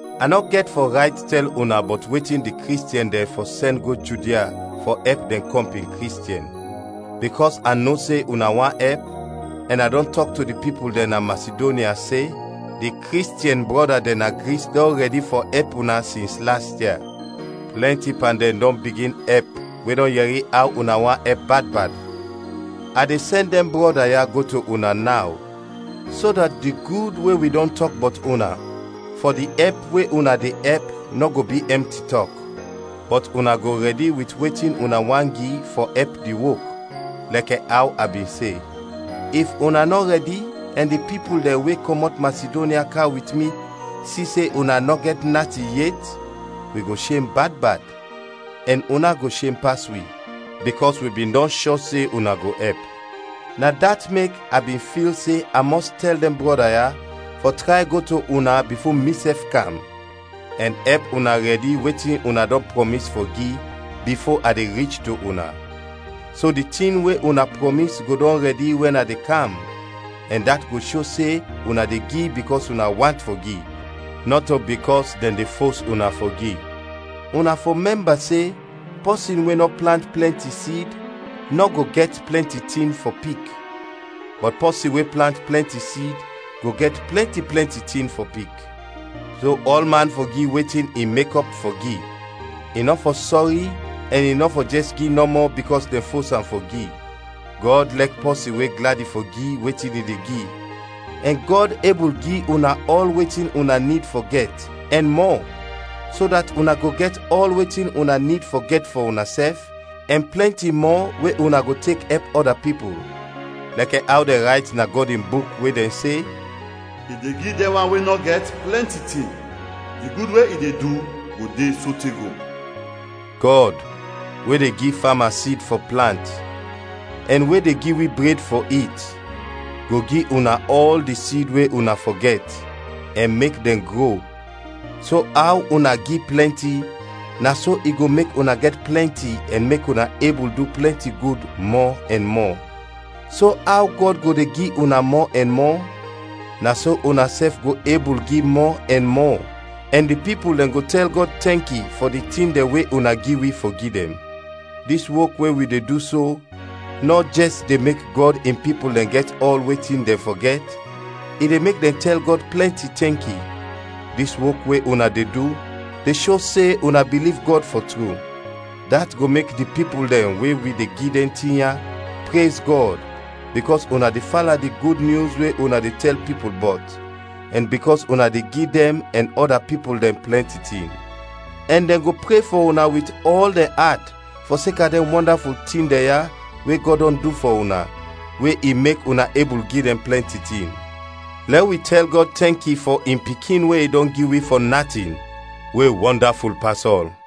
A nɔ gɛt fɔ rayt tɛl una bɔt wetin di Kristiɛn dɛn fɔ sɛn go Judia fɔ ɛp dɛn kɔmpin Kristiɛn. Bikɔs a no se una want ɛp, ɛn a dɔn tɔk to di pipul dɛn na Masidonya, se, “Di Kristiɛn brɔda dɛn na Gris dɔn rɛdi fɔ ɛp una sins las ia.” Plɛnti pan dɛn dɔn bigin ɛp we dɛn yɛri aw una want ɛp bad bad. A de sɛn dɛn brɔda ya go to una naw so dat di gud we wi dɔn tɔk bɔt una fɔ di ɛp we una de ɛp nɔ go bi ɛmti tɔk. Bɔt una go rɛdi wit wetin una want gi fɔ ɛp di wok, lɛkɛ aw a bin se. If una nɔ rɛdi ɛn di pipul dɛn we kɔmɔt Masidonya kam wit mi si se una nɔ gɛt natin yet, wi go shem bad bad ɛn una go shem pas wi bikɔs wi bin dɔn shɔ se una go ɛp. Na dat mek a bin fil se a mɔs tɛl dɛn brɔda ya fɔ tray go to una bifo misɛf kam, ɛn ɛp una rɛdi wetin una dɔn prɔmis fɔ gi bifo a de rich to una, so di tin we una prɔmis go dɔn rɛdi wɛn a kam ɛn dat go sho se una de gi bikɔs una want fɔ gi, nɔto bikɔs dɛn de fos una fɔ gi. Una fɔ mɛmba se pɔsin we nɔ plant plɛnti sid nɔ go gɛt plɛnti tin fɔ pik, bɔt pɔsin we plant plɛnti sid go gɛt plɛnti plɛnti tin fɔ pik. So ɔlman fɔ gi wetin i mekɔp fɔ gi, i nɔ fɔ sɔri ɛn i nɔ fɔ jɛs gi nɔmɔ bikɔs dɛn fos am fɔ gi; Gɔd lɛk pɔsin we gladi fɔ gi wetin i de gi. Ɛn Gɔd ebul gi una ɔl wetin una nid fɔ gɛt, ɛn mɔ, so dat una go gɛt ɔl wetin una nid fɔ gɛt fɔ unasɛf, ɛn plɛnti mɔ we una go tek ɛp ɔda pipul. Lɛkɛ aw dɛn rayt na Gɔd in Buk we dɛn se, “I de gi dɛn wan we nɔ gɛt, plɛnti tin; di gud we i de du go de sote go.” Gɔd, we de gi fama sid fɔ plant, ɛn we de gi wi bred fɔ it, go gi una ɔl di sid we una fɔ gɛt, ɛn mek dɛn gro, so aw una gi plɛnti, na so i go mek una gɛt plɛnti ɛn mek una ebul du plɛnti gud mɔ ɛn mɔ. So aw Gɔd go de gi una mɔ ɛn mɔ, na so unasɛf go ebul gi mɔ ɛn mɔ, ɛn di pipul dɛn go tɛl Gɔd tɛnki fɔ di tin dɛn we una gi wi fɔ gi dɛn. Dis wok we wi de du so nɔ jɛs de mek Gɔd in pipul dɛn gɛt ɔl wetin dɛn fɔ gɛt, i de mek dɛn tɛl Gɔd plɛnti tɛnki. Dis wok we una de du, de sho se una biliv Gɔd fɔ tru. Dat go mek di pipul dɛn we wi de gi dɛn tin ya, prez Gɔd, bikɔs una de fala di Gud Nyus we una de tɛl pipul bɔt, ɛn bikɔs una de gi dɛn ɛn ɔda pipul dɛn plɛnti tin. Ɛn dɛn go pre fɔ una wit ɔl dɛn at fɔseka dɛn wɔndaful tin dɛn ya we Gɔd dɔn du fɔ una, we i mek una ebul gi dɛn plɛnti tin. Lɛ wi tɛl Gɔd tɛnki fɔ in Pikin we i dɔn gi wi fɔ natin, we wɔndaful pas ɔl.